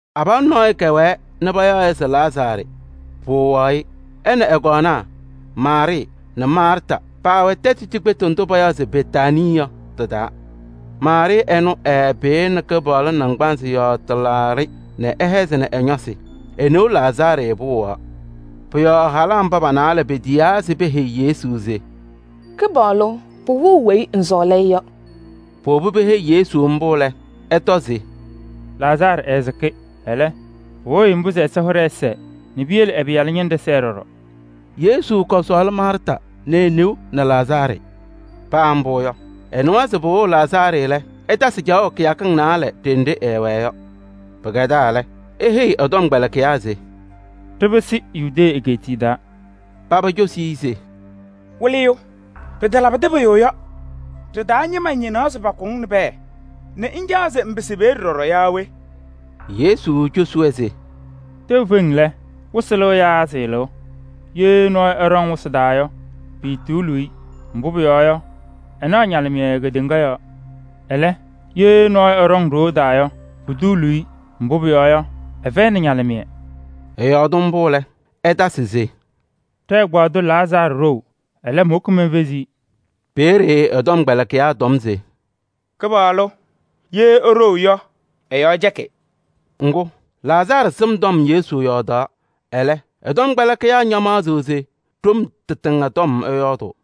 Abalʋ nɔɔyʋ kɛwɛɛ nɛ payaɣ-ɩ se Lazaarɩ, pɩwɩɣaɣ-ɩ. Ɛ nɛ ɛ-kɔɔnaa Maarɩɩ nɛ Maarta paawɛ tɛtʋ cikpetu ndʋ payaɣ se Betaanii yɔ tɩ-taa. Maarɩɩ ɛnʋ ɛɛpɩyɩnɩ Kɩpaɣlʋ naŋgbanzɩ yɔɔ tɩlaaɖɩ nɛ ɛhɛzɩnɩ ɛ-ñɔsɩ. E-neu Lazaarɩ pɩwɩɣaɣ. Pʋ-yɔɔ halaa mba pa-naalɛ petiyaa se peheyi Yesu se: “Kɩpaɣlʋ! Pɩwɩɣ weyi ŋsɔɔlɩ-ɩ yɔ.” Powobi peheyi-i mbʋ lɛ, ɛtɔ se: “Lazaarɩ ɛɛsɩkɩ. Ɛlɛ, pɩwɩɣ-ɩ mbʋ se Ɛsɔ hɩɖɛ ɛsɛɛ nɛ piyele ɛ-Pɩyalʋ ñɩnɖɛ sɛɛ ɖɔɖɔ.” Yesu kɔsɔɔlɩ Maarta nɛ e-newaa Maarɩɩ nɛ Lazaarɩ. Paa mbʋ yɔ, ɛnɩwa se pɩwɩɣ Lazaarɩ lɛ, ɛtasɩ caɣʋ kɩyakɩŋ naalɛ ɖenɖe ɛɛwɛɛ yɔ. Pɩkɛdaa lɛ, eheyi ɛ-tɔmkpɛlɩkɩyaa se: “Ɖɩpɩsɩ Yudee egeetiye taa.” Paba cosi-i se: “Wɩlɩyʋ! Pɩtalabɩdɩ pʋyʋ yɔ, ɖɩ-taa ñɩma ñɩnaɣ se pakʋ-ŋ nɛ pɛɛ nɛ ŋcaɣ se ŋpɩsɩ peeye ɖɔɖɔ yaa we?” Yesu cosi-wɛ se: “Tɛʋ feŋ lɛ, wɩsɩ lɩɣ yaa sɩɩlɩɣ? Ye nɔɔyʋ ɛɖɔŋ wɩsɩ taa yɔ, piituuluu-i, mbʋ pʋyɔɔ yɔ, ɛnaɣ ñalɩmɩyɛ kedeŋa yɔɔ. Ɛlɛ, ye nɔɔyʋ ɛɖɔŋ ɖoo taa yɔ, putuuluu-i, mbʋ pʋyɔɔ yɔ, ɛfɛyɩnɩ ñalɩmɩyɛ.” Ɛyɔɔdɩ mbʋ lɛ, ɛtasɩ se: “Ɖɛ-ɛgbaadʋ Lazaarɩ ɖou, ɛlɛ, mowoki menfezi-i.” Peeye ɛ-tɔmkpɛlɩkɩyaa tɔm se: “Kɩpaɣlʋ! Ye eɖou yɔ, ɛ-yɔɔ cɛkɩ.” Ŋgʋ, Lazaarɩ sɩm tɔm Yesu yɔɔdaɣ, ɛlɛ, ɛ-tɔmkpɛlɩkɩyaa ñamaɣzɩɣ se ɖom tɩtɩŋa tɔm ɛyɔɔdʋʋ.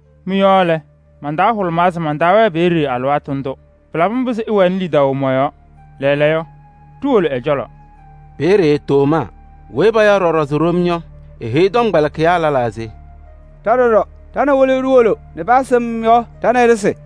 Mɩ-yɔɔ lɛ, man-taa hʋlʋmaa se mantaawɛɛ peeye alɩwaatʋ ndʋ. Pɩlabɩ mbʋ se ɩwɛnɩ lidaʋ mɔ-yɔɔ. Lɛɛlɛɛyɔ, ɖiwolo ɛ-cɔlɔ.” Peeye Tomaa weyi payaɣ ɖɔɖɔ se Ɖom yɔ, eheyi tɔmkpɛlɩkɩyaa lɛlaa se: “Ɖa ɖɔɖɔ, ɖa nɛ Wɩlɩyʋ ɖiwolo nɛ paa sɩm yɔ ɖa nɛ ɩ ɖɩsɩ!”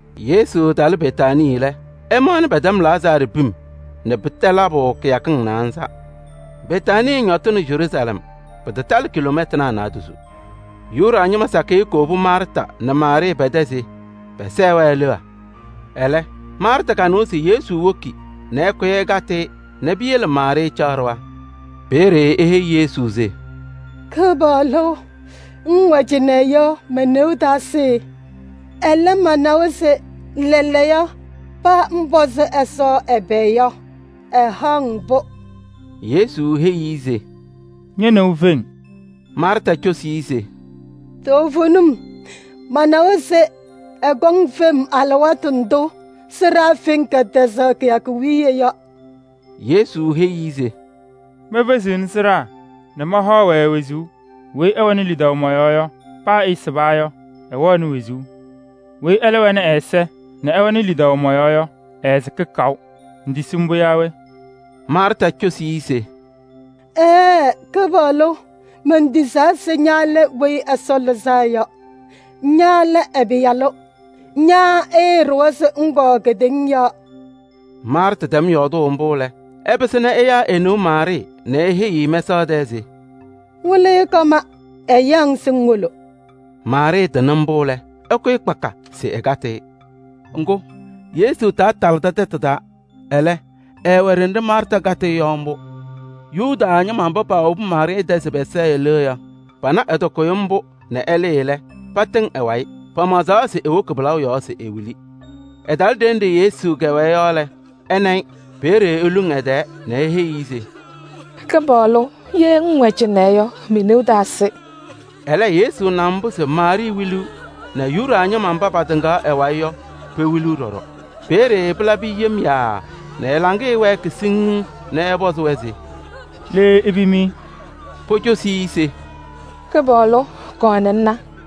Yesu talɩ Betaanii lɛ, ɛmaɣnɩ pɛtɛm Lazaarɩ pim nɛ pɩtɛ labʋ kɩyakɩŋ naanza. Betaanii ñɔtɩnɩ Yeruusalɛm. Pɩtatalɩ kiloomɛtanaa naadozo. Yuda ñɩma sakɩyɛ kowobi Maarta nɛ Maarɩɩ pɛ-tɛ se pɛsɛɛ-wɛ leɣa. Ɛlɛ, Maarta kanɩwa se Yesu woki nɛ ɛkʋyɩ ɛkatɩ-ɩ nɛ piyele Maarɩɩ caɣ ɖɩɣa. Peeye eheyi Yesu se: “Kɩpaɣlʋ! Ŋŋwɛ cɩnɛ yɔ, me-neu taasɩ. Ɛlɛ, manawa se: lɛɛlɛɛyɔ, paa ŋpɔzɩ Ɛsɔ ɛbɛ yɔ, ɛhaɣ-ŋ-pʋ.” Yesu heyi-i se: “Ñe-neu feŋ.” Maarta cosi se: “Toovenim, manawa se ɛkɔŋ fem alɩwaatʋ ndʋ sɩɖaa feŋ kɛtɛzaɣ kɩyakʋ wiye yɔ.” Yesu heyi-i se: “Mefeziɣni sɩɖaa nɛ mahaɣ-wɛ wezuu. Weyi ɛwɛnɩ lidaʋ mɔ-yɔɔ yɔ, paa ɛsɩba yɔ, ɛwɛɣ wezuu. Weyi ɛlɛ wɛnɩ ɛ-ɛza nɛ ɛwɛnɩ lidaʋ mɔ-yɔɔ yɔ, ɛɛsɩkɩ kaʋ. Ŋtisi mbʋ yaa we?” Maarta cosi-i se: “Ɛɛɛ, Kɩpaɣlʋ! Mentisaa se ña lɛ Weyi Ɛsɔ Lɩzaa Yɔ. Ña lɛ ɛ-Pɩyalʋ, ña ɛɛɖʋwa se ŋkɔŋ kedeŋa yɔɔ.” Maarta tɛm yɔɔdʋʋ mbʋ lɛ, ɛpɩsɩ nɛ ɛyaa e-neu Maarɩɩ nɛ eheyiɣ-i mɛsaɣ tɛɛ se: “Wɩlɩyʋ kɔma, ɛyaɣ-ŋ se ŋwolo.” Maarɩɩ tɩnɩ mbʋ lɛ, ɛkʋyɩ kpaka se ɛkatɩ-ɩ. Ŋgʋ, Yesu taatalɩdɩ tɛtʋ taa, ɛlɛ, ɛɛwɛ ɖenɖe Maarta kakatɩ-ɩ yɔ mbʋ. Yuda ñɩma mba paawobi Maarɩɩ tɛ se pɛsɛɛ-ɩ leɣa yɔ, pana ɛtɩkʋyɩ mbʋ nɛ ɛlɩɩ lɛ, patɩŋ ɛ-wayɩ. Pamaɣzaɣ se ewoki pɩlaʋ yɔɔ se ewili. Ɛtalɩ ɖenɖe Yesu kɛwɛɛ yɔ lɛ, ɛna-ɩ. Peeye eluŋ ɛ-tɛɛ nɛ eheyi-i se: “Kɩpaɣlʋ! Ye ŋŋwɛ cɩnɛ yɔ, me-neu taasɩ.” Ɛlɛ Yesu na se Maarɩɩ wiliɣ nɛ Yuda ñɩma mba patɩŋaɣ ɛ-wayɩ yɔ, pewiliɣ ɖɔɖɔ. Peeye pɩlabɩ-ɩ yem yaaa nɛ ɛ-laŋɩyɛ wɛɛkɩ siŋŋ nɛ ɛpɔzɩ-wɛ se: “Le ipim-i?” Pocosi-i se: “Kɩpaɣlʋ! Kɔɔ nɛ ŋna.”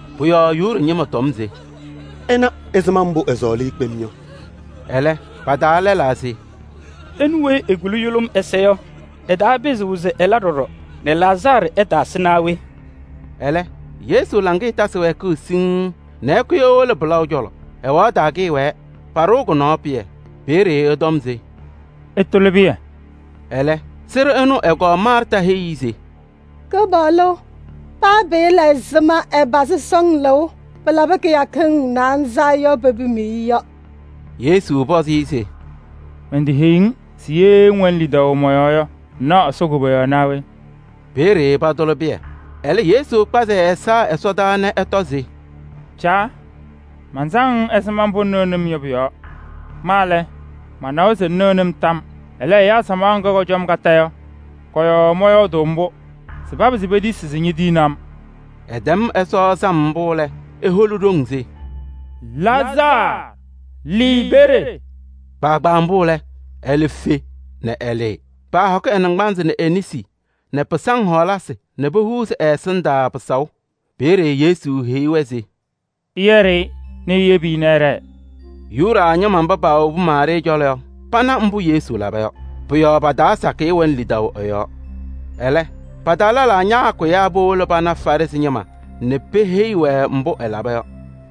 Pʋ-yɔɔ Yuda ñɩma tɔm se: “Ɩna ɛzɩma mbʋ ɛɛsɔɔlɩ-ɩ kpem yɔ!” Ɛlɛ, pa-taa lɛlaa se: “Ɛnʋ weyi ekuli yʋlʋm ɛza yɔ, ɛtaapɩzɩɣ se ɛla ɖɔɖɔ nɛ Lazaarɩ ɛtaasɩ naa we?” Ɛlɛ, Yesu laŋɩyɛ tasɩ wɛɛkʋʋ siŋŋ nɛ ɛkʋyɩ ewolo pɩlaʋ cɔlɔ. Ɛwaɣ taa kɩɩwɛɛ, paɖɩɣ kʋ-nɔɔ pɩyɛ. Peeye ɛtɔm se: “Ɩtʋlɩ pɩyɛ.” Ɛlɛ, sɩɖʋ ɛnʋ ɛ-kɔɔ Maarta heyi-i se: “Kɩpaɣlʋ! Paa pɩɩla ɛzɩma ɛpazɩ sɔŋ lɩʋ: pɩlabɩ kɩyakɩŋ naanza yɔ pepim-i yɔ.” Yesu pɔzɩ-ɩ se: “Menteheyi-ŋ se ye ŋwɛnɩ lidaʋ mɔ-yɔɔ yɔ ŋnaɣ Ɛsɔ koboyaɣ naa we?” Peeye patʋlɩ pɩyɛ. Ɛlɛ Yesu kpazɩ ɛ-ɛza ɛsɔdaa nɛ ɛtɔ se: “Caa! Mansaŋ-ŋ ɛzɩma mbʋ ŋnɩnɩ-m yɔ pʋ-yɔɔ. Ma lɛ, manawa se ŋnɩɣnɩ-m tam yɔɔ. Ɛlɛ, ɛyaa samaɣ ŋga kɔcɔ-m kondiko yɔ, kɔ-yɔɔ mɔyɔɔdʋʋ mbʋ se papɩzɩ petisi se ñetiyini-m.” Ɛtɛm Ɛsɔ sam mbʋ lɛ, eholi ɖoŋ se: “Lazaarɩ! Lɩɩ peeye!” Kpaagbaa mbʋ lɛ, ɛlɛ fe nɛ ɛlɩɩ. Paahɔkɩ ɛ-naŋgbanzɩ nɛ e-nesi pa-taa pɩsaʋ hɔɔlasɩ nɛ pohuuzi ɛ-ɛsɩndaa pɩsaʋ. Peeye Yesu heyi-wɛ se: “Ɩyɛɖɩ-ɩ nɛ iyebi-i ɛɖɛɛ.” Yuda ñɩma mba paawobi Maarɩɩ cɔlɔ yɔ, pana mbʋ Yesu laba yɔ. Pʋ-yɔɔ pa-taa sakɩyɛ wɛnɩ lidaʋ ɛ-yɔɔ. Ɛlɛ, pa-taa lɛlaa ñaakʋyaa powolo pana Farɩsɩ ñɩma nɛ peheyi-wɛ mbʋ ɛlaba yɔ.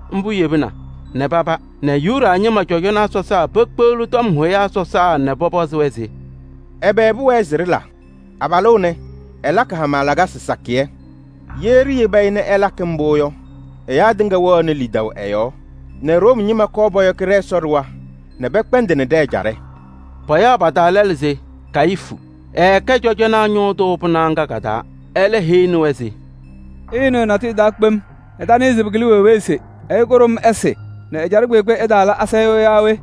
Mbʋ yebina nɛ paba nɛ Yuda ñɩma cɔjɔnaa sɔsaa pekpeɣli tɔm hʋyaa sɔsaa nɛ pɔpɔzɩ-wɛ se: “Ɛbɛ pʋwɛɛ se ɖɩla? Abalʋ ɛnɛ, ɛlakɩ hama lakasɩ sakɩyɛ! Ye ɖiyebi-i nɛ ɛlakɩ mbʋ yɔ, ɛyaa tɩŋa wɛɣnɩ lidaʋ ɛ-yɔɔ nɛ Room ñɩma kɔɔ pɔyɔkɩ ɖɛ-Ɛsɔ ɖɩɣa nɛ pɛkpɛndɩnɩ ɖɛ-ɛjaɖɛ!” Payaɣ pa-taa lɛlʋ se Kayifu, ɛkɛ cɔjɔnaa ñʋʋ tʋ pɩnaɣ ŋga, ɛlɛ heyini-wɛ se: “Ɩɩnɩɣ natʋyʋ! Ɩtanɩɩ se pɩkɩlɩ-mɩ wee wee se ɛyʋ kʋɖʋm ɛsɩ nɛ ɛjaɖɛ kpeekpe ɛtaala asayʋʋ yaa we?”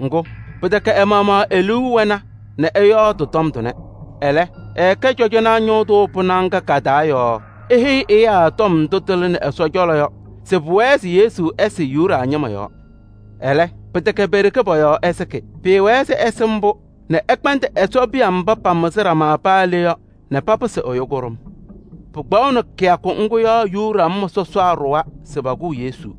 Ŋgʋ, pɩtɛkɛ ɛ-maɣmaɣ e-liu wɛna nɛ ɛyɔɔdɩ tɔm tʋnɛ. Ɛlɛ, ɛɛkɛ cɔjɔnaa ñʋʋ tʋ pɩnaɣ ŋga ka-taa yɔɔ eheyi ɛyaa tɔm ndʋ tɩlɩnɩ Ɛsɔ cɔlɔ yɔ se pʋwɛɛ se Yesu ɛsɩ Yuda ñɩma yɔɔ. Ɛlɛ, pɩtɛkɛ pe-ɖeke pɔ-yɔɔ ɛsɩkɩ. Pɩɩwɛɛ se ɛsɩ mbʋ nɛ ɛkpɛndɩ Ɛsɔ piya mba pamɩzɩ ɖama paa le yɔ nɛ papɩsɩ ɛyʋ kʋɖʋm. Pɩkpaɣʋnɩ kɩyakʋ ŋgʋ yɔ Yuda ñɩma sɔsaa ɖʋwa se pakʋʋ Yesu.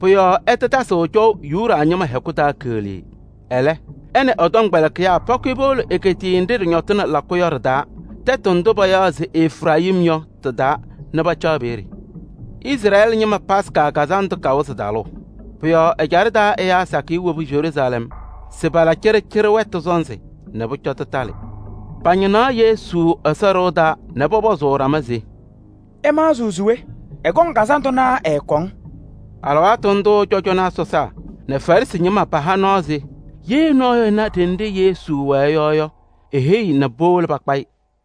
Pʋ-yɔɔ ɛtatasɩɣ cɔʋ Yuda ñɩma hɛkʋ taa keɣlee. Ɛlɛ, ɛ nɛ ɛ-tɔmkpɛlɩkɩyaa pakʋyɩ powolo egeetiye nɖɩ ɖɩñɔtɩnɩ lakʋ yɔ ɖɩ-taa, tɛtʋ ndʋ payaɣ se Efirayim yɔ, tɩ-taa nɛ pacaɣ peeye. Izrɛɛlɩ ñɩma Yomiye Taa Lɩʋ Kazandʋ kawɩzɩ talʋʋ. Pʋ-yɔɔ ɛjaɖɛ taa ɛyaa sakɩyɛ wobi Yeruusalɛm se pala cɩɖɩcɩɖɩ wɛtʋ sɔnzɩ nɛ pʋcɔ tɩtalɩ. Pañɩnaɣ Yesu Ɛsɔ ɖɩɣa taa nɛ pɔpɔzʋʋ ɖama se: “Ɩmaɣzɩɣ se we? Ɛkɔŋ kazandʋ naa ɛɛkɔŋ?” Alɩwaatʋ ndʋʋ cɔjɔnaa sɔsaa nɛ Farɩsɩ ñɩma paha nɔɔ se: ye nɔɔyʋ ɛna ɖenɖe Yesu wɛɛ yɔ yɔ, eheyi nɛ powolo pakpa-ɩ.